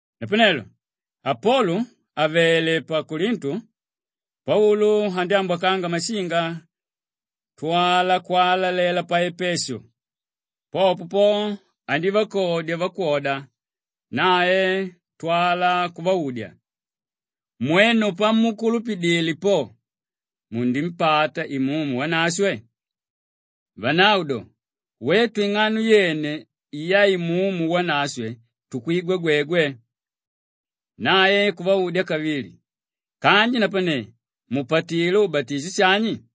Napanelo Apolu àvele pa Kolintu, Paulu andyámbwakanga mashinga kutwala kwalalela pa Epeshu. Popo po andívakodya vakwoda, nae kutwala kuvaudya, “Mwenu pamukulupidile po, munimpata Imumu Wanashwe?” Vanavo do, “Wetu ing'ano yene ya Imumu Wanashwe tukwigwa gwegwe.” Nae kuvaudya kavili, “Kanji napane mupatilé ubatisho shani?”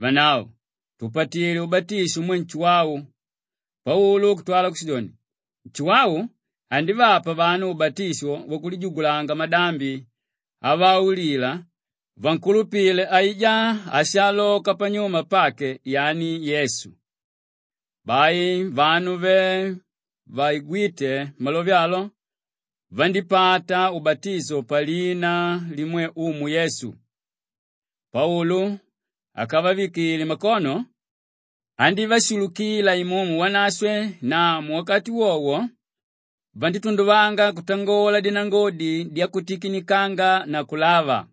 Vanavo, “Tupatilé ubatisho umwe Nshuwau.” Paulu kutwala kushidoni, “Nshuwau andívapa vanu ubatisho wakulijugulanga madambi avaulila vankulupile aijá áshaaloka panyuma pake, yani Yesu.” Bai vanu ve vaigwíte malove alo, vandípata ubatisho palina limwe Umu Yesu. Paulu akavavikile makono, andívashulukila Imumu Wanashwe na muwakati wowo vandítunduvanga kutangola dinangodi dyakutikinikanga na kulava.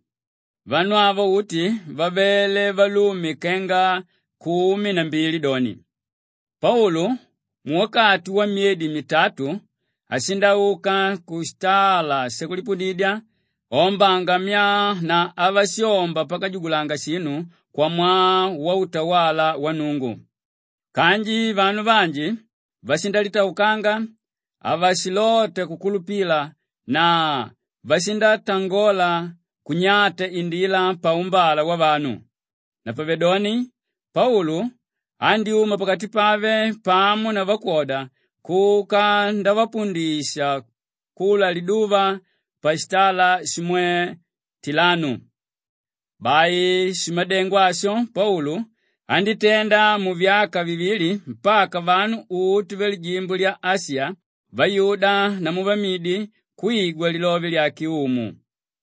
Vanu avo uti vavele valume kenga kumi na mbili doni. Paulu muwakati wamyedi mitatu, ashindauka kushitala shakulipudidya aombanga myaa na avashomba pakajugulanga shinu kwamwaa wautawala wa Nnungu. Kanji vanu vanji vashindalitaukanga, havashilota kukulupila na vashindatangola kunyata Indila paumbala wavanu. Napavedoni Paulu andyúma pakati pave pamo na vakwoda kuka ndavapundisha kula liduva pashitala shimwe Tilanu. Bai shimadengo asho Paulu andítenda muvyaka vivili mpaka vanu uti valijimbo lya Ashiya, vayuda namu vamidi kwigwa lilove lyake Umu.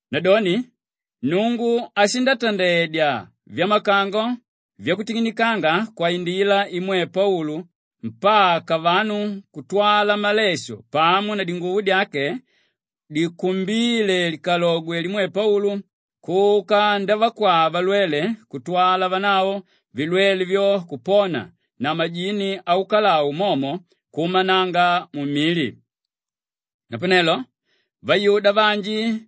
Nadoni Nnungu ashindatandedya vyamakango vyakutikinikanga kwaindila imwe Paulu mpaka vanu kutwala malesho pamo na dinguvo dye dikumbíle likalogwe limwe Paulu kuka ndavakwaa valwele kutwala vanavo vilwele vyo kupona na majini aukalau momo kuumananga mumili. Napanelo vayuda vanji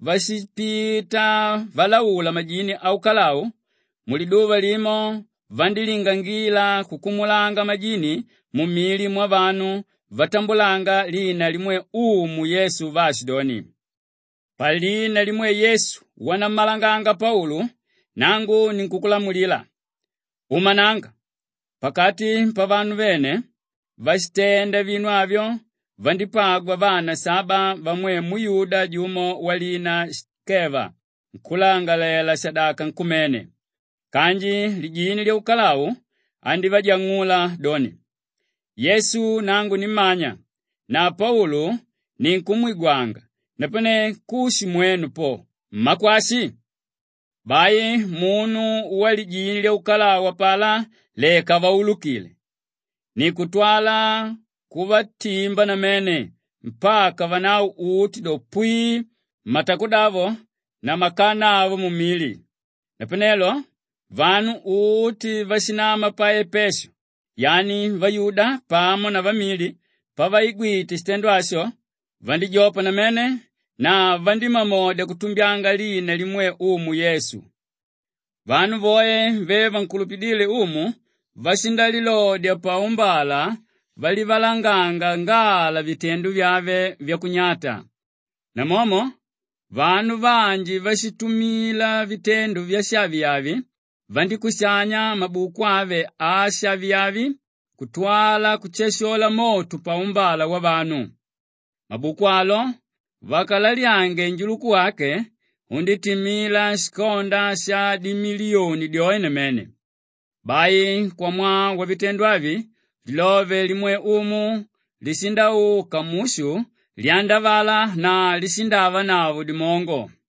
váshipita valaula majini aukalau, muliduva limo vandílingangila kukumulanga majini mumili vyavanu vatambulanga lina limwe Umu Yesu vaashidoni, “Palina limwe Yesu wanammalanganga Paulu, nangu ninkunnamulila, uumananga!” Pakati pavanu vene váshitenda vinu avyo vandípagwa vana saba vamwe muyuda jumo walina Shikeva nkúlangalalela-shadaka nkumene. Kanji lijini lyaukalau andívajang'ula doni, “Yesu nangu nimmanya na Paulu ninkumwigwanga; napane kushi mwenu po, mmakwashi?” Bai munu walijini lyaukalau apalá leka avaulukile! Ni kutwala kuvatimba namene mpaka vanavo uti do, pwii, matakudavo na makana avo mumili. Napanelo vanu uti váshinama pa Epeshu yani vayuda pamo na vamidi pavaigwite shitendo asho vandíjopa namene na vandímamodya kutumbyanga lina limwe Umu Yesu. Vanu voe ve vankulupidíle Umu vashindalilodya paumbala valivalanganga ngala vitendo vyave vyakunyata. Namomo vanu vanji váshitumila vitendo vyashaviavi, vandíkushania mabuku ave ashaviavi kutwala kushashola moto paumbala wavanu. Mabuku alo vakalalyange njuluku wake, undítimila shikonda shadimiliyoni dyoe namene. Bai kwamwaa wavitendo avi, lilove limwe Umu lishindauka mushu lyandavala na lishindaavanavo dimongo.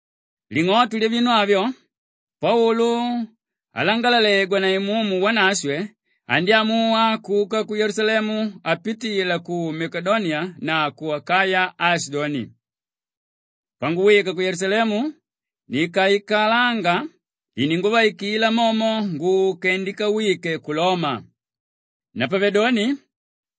Ling'oto lyavinu avyo, Paulu alangalalegwa na Imumu Wanashwe andyámuwa kuka ku Yelusalemu apitila ku Makedoniya na ku Akaya aashidoni, “Panguwika ku Yelusalemu nikaikalanga, ininguvaikila momo nguke ndikawike ku Loma.” Napavedoni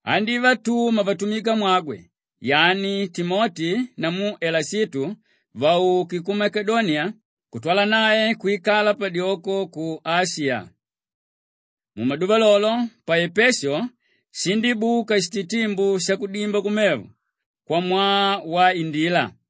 andívatuma vatumikamwagwe yani Timoti namu Elashitu vauke ku Makedoniya kutwala nae kwikala padyoko ku Ashiya. Mumaduva lolo, pa Epeshu shindíbuka shititimbu shakudimba kumevo kwamwaa wa Indila.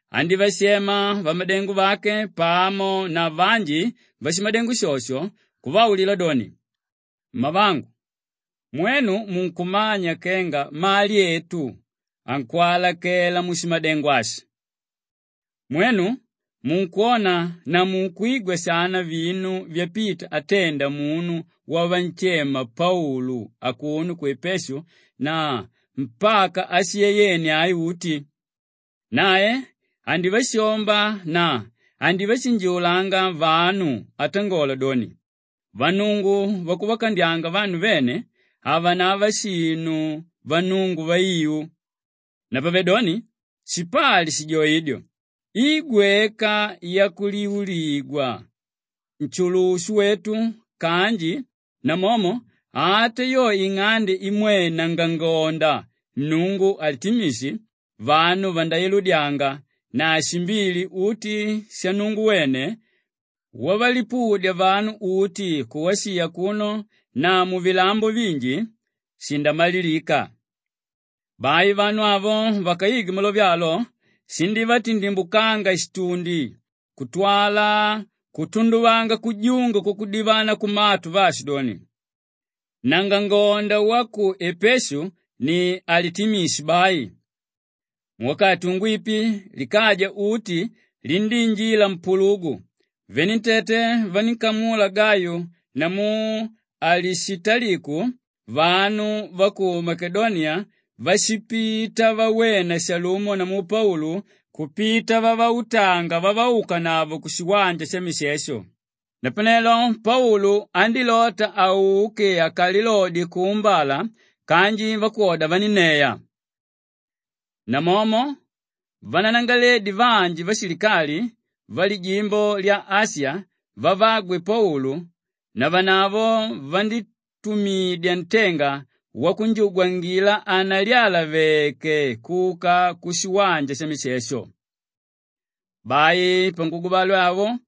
andívashema vamadengo vake pamo na vanji vashimadengo shosho kuvaulila doni, “Mmavangu, mwenu munkumanya kenga mali etu ankwalakela mushimadengo ashi. Mwenu munkwona na munkwigwa shana vinu vyapita atenda munu wavanshema Paulu akuno ku Epeshu na mpaka Ashiya yene ai uti. Nae andívashomba na andivashinjiulanga vanu atangola doni, ‘Vannungu vakuvakandyanga vanu vene havanava shinu vannungu vaiu.’ Napavedoni shipali shijoidyo i gweka yakuliuligwa nshulushu wetu kanji namomo ata yo ing'ande imwe nangangonda nnungu Alitimishi, vanu vandailudyanga na shimbili uti shannungu wene wavalipudya vanu uti ku Ashiya akuno na muvilambo vinji, shindamalilika.” Bai vanu avo vakaigwe malove alo, shindívatindimbukanga shitundi kutwala kutunduvanga kujunga kwakudivana kumatu vaashidoni, “Nangangonda wa ku Epeshu ni Alitimishi bai.” Muwakati ungwipi likaja uti lindíinjila mpulugu; venentete vanínkamula Gayu namu Alishitaliku vanu va ku Makedoniya váshipita vawena shalumo namu Paulu kupita vavautanga vavaukanavo kushiwanja shamishesho. Napanelo Paulu andílota auke akalilodye kuumbala kanji vakwoda vanínneya. Namomo vananangaleledi vanji vashilikali valijimbo lya Ashiya vavagwe Paulu navanavo vandítumidya ntenga vanjugwangila hanalyalaveke kuka kushiwanja shamishesho. Bai panguguvale awo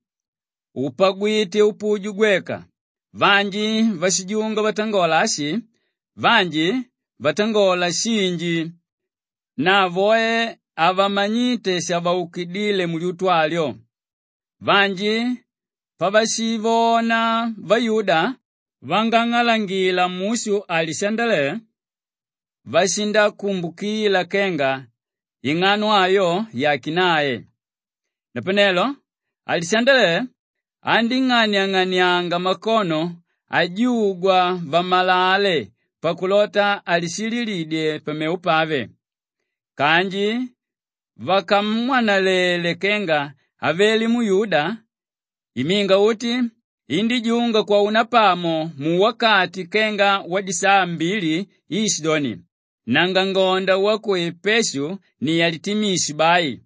upagwite upuju gweka; vanji váshijunga vatangola ashi, vanji vatangola shinji na voe havamanyíte shavaukidile mulyutu alyo. Vanji pavashivona vayuda vangang'alangila mushu Alishandele, vashikumbukila kenga ing'ano ayo yàke nae. Napanelo Alishandele andíng'aniang'anianga makono ajugwa vamalale pakulota alishililidye pamevo pave. Kanji vakamwanalele kenga avele muyuda, iminga uti indíjunga kwaunapamo muwakati kenga wadisaa mbili iishidoni, “Nangangonda wa ku Epeshu ni Alitimishi bai!”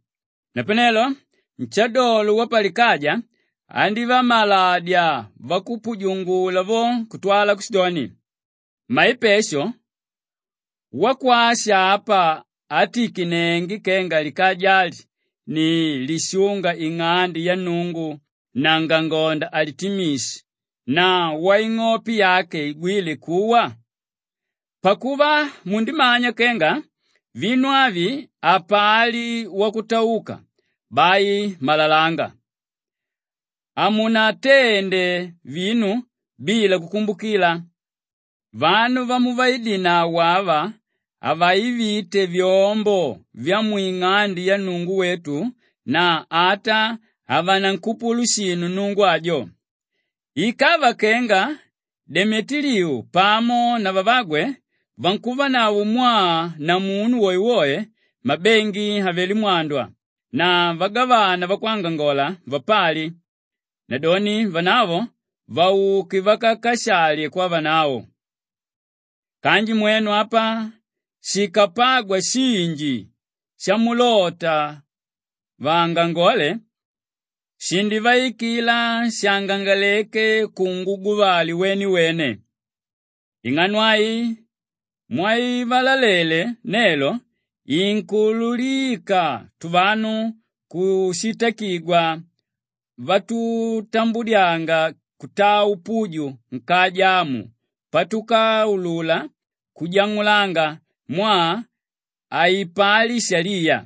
Napanelo nshadolo wapalikaja andívamaladya vakupujungula vo kutwala kushidoni, “Mmaepeshu, wakwashi apa átikinenge kenga likaja ali ni lishúnga ing'ande yannungu nangangonda Alitimishi na waing'ope yake igwíle kuwa? Pakuva mundimanya kenga vinu avi hapali wakutauka, bai malalanga! Hamunatende vinu bila kukumbukila! Vanu vamuviidinavo ava havaivite vyombo vyamwing'ande yannungu wetu na ata havanankupulu shinu nnungu ajo. Ikava kenga Demetiliu pamo na vavagwe vankuvanavo mwaa na munu woewoe, mabengi avelé mwandwa na vagavana vakwangangola vapali; nadoni vanavo vauke vakakashali kwanavo. Kanji mwenu apa shikapagwa shinji shamulota vaangangole, shindivaikila shangangaleke kunguguvale wenewene. Ing'ano ai mwaivalalele nelo inkuululika tuvanu kushitakigwa vatutambudyanga kutaa upuju nkaja amu patukaulula kujang'ulanga mwaa haipali shaliya.”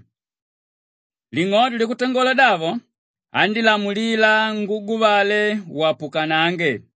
Ling'oto lyakutangola davo, andílamulila nguguvale wapukanange.